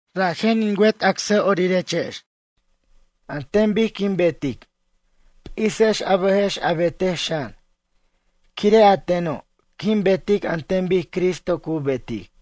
Rajen in wet acsa'orirex, an ten bic quin betic, p'isex a bʌjex a betej xan. Quire' a teno' quin betic an ten bic Cristo cu betic.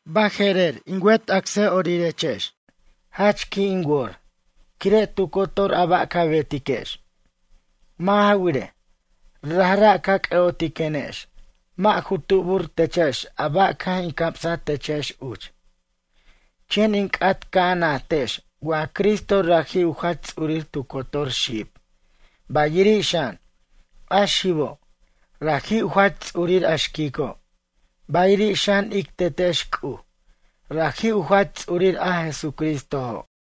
Baje'rer, in wet acsa'orirex, jach qui' in wor, quire' tu cotor a ba' ca betiquex. Mʌ' ja wirej, rajra' ca c'ʌ'otiquenex, mʌ' ju tubur techex a ba' caj in camsaj techex uch. Chen in c'at ca' a najtex wa Cristo raji' u jach ts'urir tu cotor xib, bayiri' xan, a xibo', raji' u jach ts'urir a xquico', bayiri' xan ic Tetex C'uj raji' u jach ts'urir a Jesucristojo'.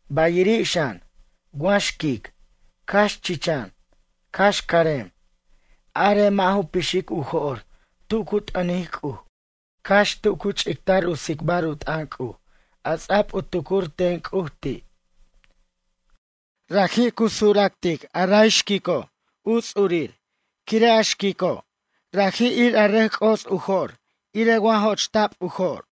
Bayiri' xan, wa xquic, cax chichan, cax carem, arej mʌ' ju pixic u jo'r tu cu t'ʌnic C'uj, cax tu cu ch'ictar u tsicbar u t'ʌn C'uj a ts'a'b u tucur ten C'uj ti'. Raji' cu sura'ctic a ray xquico' u ts'urir quire' a xico' raji' ir a xquico' rʌc c'os u jo'r irej wa jo'chta'b u jo'r.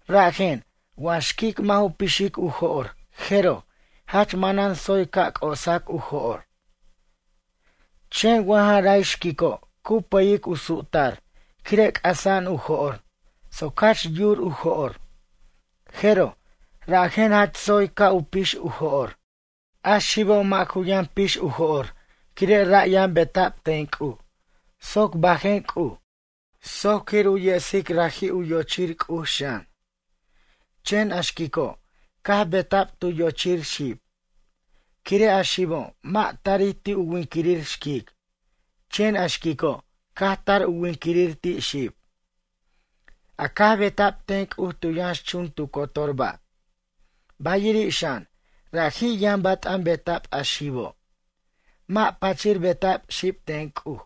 Rajen, wa xquic mʌ' ju pixic u jo'r jeroj, jach manan tsoy ca' c'osac u jo'r. Chen wa ja ray xquico' cu pʌyic u su'tar quire' c'asa'an u jo'r soc jach yur u jo'r, jeroj rajen jach tsoy ca' u pix u jo'r. A xibo' mʌ' ju yʌn p'ix u jo'r quire' ray yʌn beta'b ten C'uj soc bajen C'uj, soc quir u yesic raji' u yochir C'uj xan. Chen a xquico', caj beta'b tu yochir xib. Quire' a xibo' mʌ' tarij ti' u winquirir xquic, chen a xquico' caj tar u winquirir ti' xib, a caj beta'b ten C'uj tu yʌnxchun tu cotor ba'. Bayiri' xan, raji' yʌn bat'an beta'b a xibo', mʌ' pachir beta'b xib ten C'uj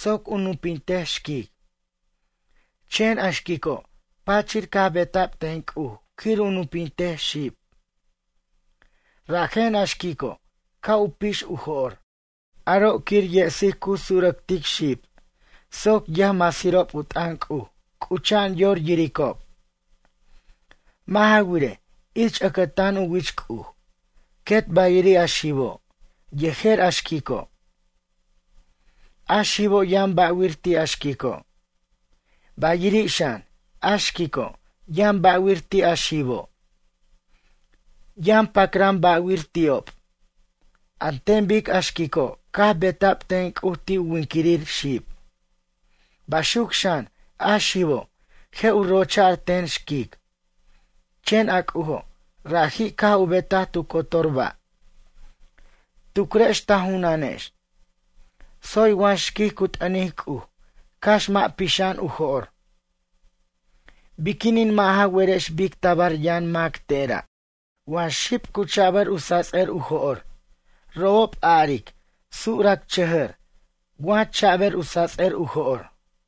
soc u nupintej xquic. Chen a xquico' pachir caj beta'b ten C'uj quir u nupintej xib. Rajen, a xquico' ca' u pix u jo'r, aro' quir yesic cu surʌctic xib soc yʌjmasirob u t'ʌn C'uj c'ucha'an yor yiricob. Mʌ' ja wirej, ich ʌcʌtan u wich C'uj, quet bayiri' a xibo', yejer a xquico'. A xibo' yʌn ba'wir ti' a xquico', bayiri' xan, a xquico', yʌn ba'wir ti' a xibo'. Yʌn pacran ba'wir ti'ob. An ten bic a xquico' caj beta'b ten C'uj ti' u winquirir xib. Baxuc xan, a xibo', je' u rocha'r ten xquic, chen a C'ujo', raji' caj u betaj tu cotor ba'. Tucrex ta junanex. Tsoy wa xquic cu t'ʌnic C'uj cax mʌ' pixa'an u jo'r? Biquinin mʌ' ja werex bic tabar yʌn mac tera', wa xib cu cha'bʌr u sats'ʌr u jo'r, robob a'aric suracchʌjʌr wa cha'bʌr u sats'ʌr u jo'r.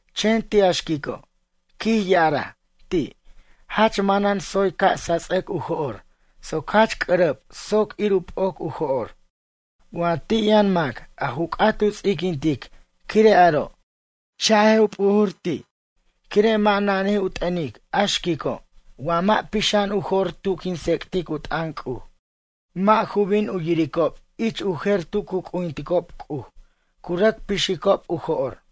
Chen ti' a xquico', quij ya'araj ti', jach manan tsoy ca' sats'ʌc u jo'r soc jach c'ʌrʌb soc ir u p'oc u jo'r. Wa ti' yʌn mac a ju c'at u ts'iquintic quire' aro', cha'j u p'ujur ti', quire' mʌ' nanij u t'ʌnic a xquico' wa mʌ' pixa'an u jo'r tu quin tsec'tic u t'ʌn C'uj. Mʌ' ju bin u yiricob ich u jer tu cu c'ujinticob C'uj, cu rʌc pixicob u jo'r.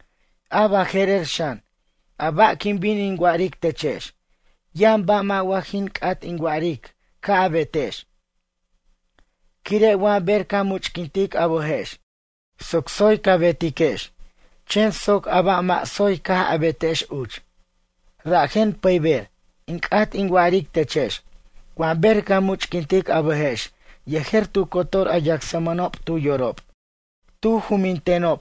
A baje'rer xan, a ba' quin bin in wa'aric techex, yʌn ba' wa mʌ' jin c'at in wa'aric ca' a betex. Quire' wa ber ca much'quint a bʌjex soc tsoy ca betiquex chen soc a ba' mʌ' tsoy caj betex uch. Rajen pʌyber, in c'at in wa'aric techex, wa ber ca much'quint a bʌjex yejer tu cotor a yacsmʌnob tu yorob, tu jumbintenob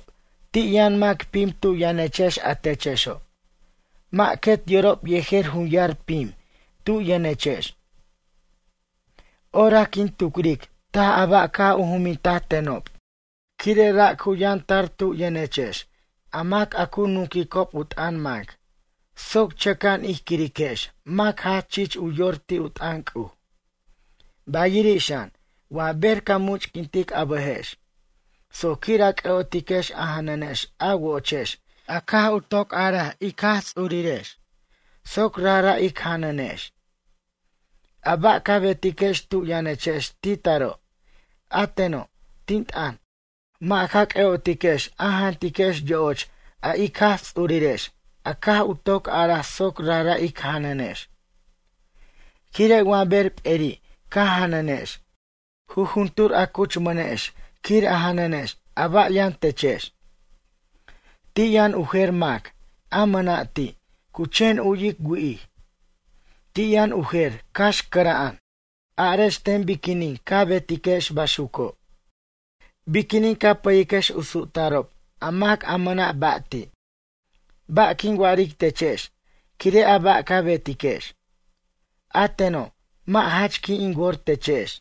ti' yʌn mac pim tu yʌnechex a techexo', mʌ' quet yorob yejer junyar pim tu yʌnechex. Orac quin tucric taj a ba' caj u jumbinta tenob. Quire' ra' cu yʌntar tu yʌnechex a mac a cu nunquicob u t'ʌn mac, soc chʌca'an ij quiriquex mac jach chich u yor ti' u t'ʌn C'uj. Bayiri' xan, wa ber ca much'quint a bʌjex, soc quir a c'ʌ'otiquex a janʌnex a wo'ochex a caj u toc ar ic Jaj Ts'urirex soc rajra' ic janʌnex. A ba' ca betiquex tu yʌnechex ti taro', a teno', tin t'ʌn, mʌ' ja c'ʌ'otiquex a jantiquex yo'och a ic Jaj Ts'urirex a caj u toc araj soc rajra' ic janʌnex. Quire' wa ber p'eri ca janʌnex, jujuntur a cuchmanex quir a janʌnex a ba' yʌn techex. Ti' yʌn u jer mac, a mʌna' ti', cu chen u'yic wi'ij. Ti' yʌn u jer cax cʌra'an. Arex ten biquinin ca betiquex baxuco'? Biquinin ca pʌyiquex u su'tarob a mac a mʌna' ba' ti'? Ba' quin wa'aric techex quire' a ba' ca betiquex? A teno', mʌ' jach qui' in wor techex.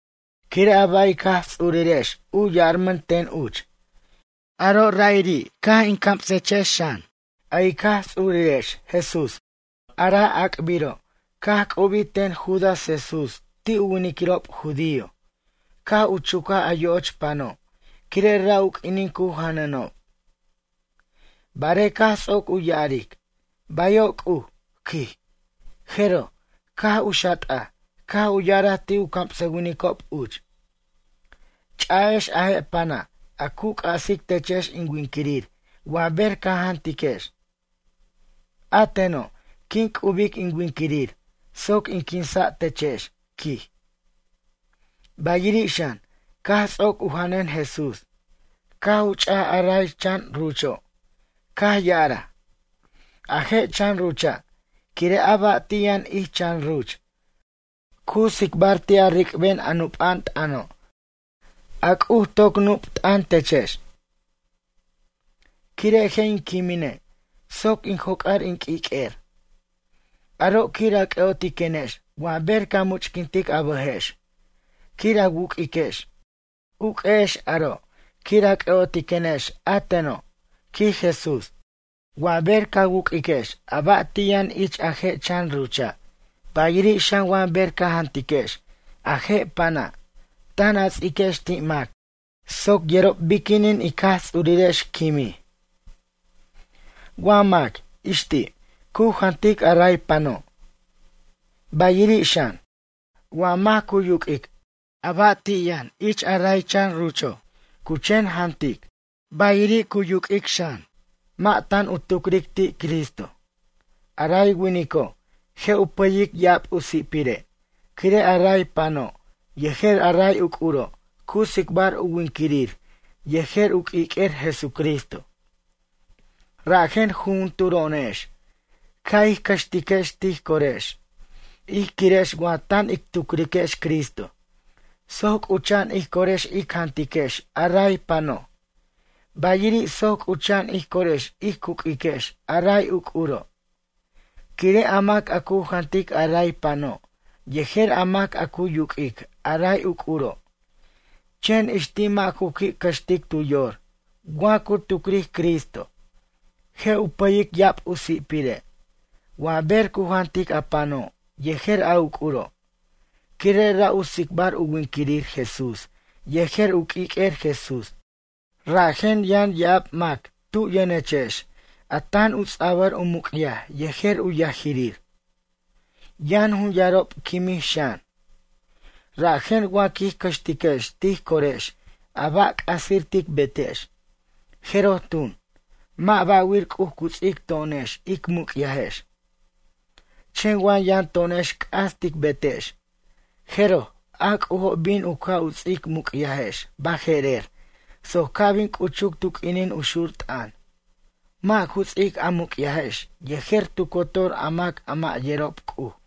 Quire' a ba' ic Jaj Ts'urirex u yarmʌn ten uch, aro' ra'iri' caj in camsechex xan. A ic Jaj Ts'urirex Jesús, a ra' ac'biro' caj c'ubij ten Judas Jesús ti' u winiquirob judío, caj u chucaj a yo'och pano', quire' ra' u q'uinin cu janʌnob. Barej caj ts'oc u ya'aric: “Bayo' C'uj”, quij, jeroj, caj u xat'aj, caj u ya'araj ti' u camsʌwinicob uch: “Ch'a'ex a je' pana' a cu c'asic techex in winquirir wa ber ca jantiquex. A teno', quin c'ubic in winquirir soc in quinsa' techex”, quij. Bayiri' xan, caj ts'oc u janʌn Jesús, caj u ch'aj a ray chan rucho', caj ya'araj: “A je' chan rucha', quire' a ba' ti' yʌn ich chan ruch, cu tsicbar ti' a ric'ben a nupa'an t'ʌno', a C'uj toc nup t'ʌn techex, quire' je' in quimine' soc in joc'ar in q'uiq'uer. Aro' quir a c'ʌ'otiquenex wa ber ca much'quintic a bʌjex quir a wuq'uiquex. Uq'uexex aro', quir a cʌ'otiquenex a teno'”, quij Jesús. Wa ber ca wuq'uiquex a ba' ti' yʌn ich a je' chan rucha', bayiri' xan wa ber caj jantiquex a je' pana', tan a ts'iquex ti' mac soc yerob biquinin ic Jaj Ts'urirex quimij. Wa mac, ix ti', cu jantic a ray pano', bayiri' xan, wa mac cu yuq'uic a ba' ti' yʌn ich ray chan rucho', cu chen jantic, bayiri' yuq'uic xan, mʌ' tan u tucric ti' Cristo. A ray winico' je' u pʌyic ya'ab u si'pire', quire' a ray pano' yejer a ray uc'uro' cu tsicbar u winquirir yejer u q'uiq'uer Jesucristo. Rajen jujunturo'onex ca' ij cʌxtiquex tij corex ij quirex wa tan ic tucriquex Cristo, soc c'ucha'an ij corex ic jantiquex a ray pano', bayiri' soc c'ucha'an ij corex ic uq'uex a ray uc'uro'. Quire' a mac a cu jantic a ray pano', yejer a mac a cu yuq'uic a ray uc'uro', chen ix ti' mʌ' ju qui' cʌxtic tu yor wa cu tucric Cristo, je' u pʌyic ya'ab u si'pire' wa ber cu jantic a pano' yejer a uc'uro', quire' ra' u tsicbar u winquirir Jesús yejer u q'uiq'uer Jesús. Rajen yʌn ya'ab mac tu' yʌnechex a tan u ts'abʌr u muc'yaj yejer u yajirir. Yʌn jun yarob quimij xan. Rajen wa quij cʌxtiquex tij corex a ba' c'asir tic betex, jeroj tun, mʌ' ba'wir C'uj cu ts'ic to'onex ic muc'yajex. Chen wa yʌn to'onex c'as tic betex, jeroj a C'ujo' bin u ca' u ts'ic muc'yajex baje'rer soc ca' bin c'uchuc tu q'uinin u xur t'ʌn, mʌ' ju ts'ic a muc'yajex yejer tu cotor a mac a mʌ' yerob C'uj.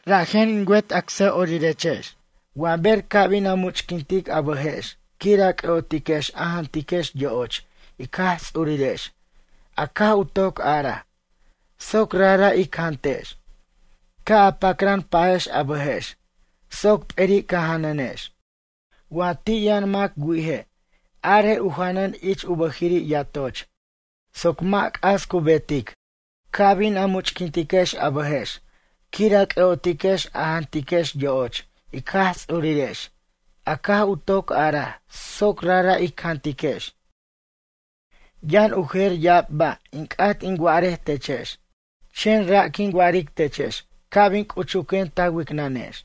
Rajen in wet acsa'orirex wa ber ca' bin a much'quint a bʌjex quir a c'ʌ'otiquex a jantiquex yo'och ic Jaj Ts'urirex a caj u toc araj, soc rajra' ic jantex, ca' a pacran pajex a bʌjex soc p'eri' ca' janʌnex. Wa ti' yʌn mac wi'ije', arej u janʌn ich u bʌjiri' yatoch soc mʌ' c'as cu betic, ca' bin a much'quintex a bʌjex quir a c'ʌ'otiquex a jantiquex yo'och, ic Jaj Ts'urirex a caj u toc araj soc rajra' ic jantiquex. Yʌn u jer ya'ab ba' in c'at in wa'arej techex chen ra' quin wa'aric techex ca' bin c'uchuquen ta wicnʌnex.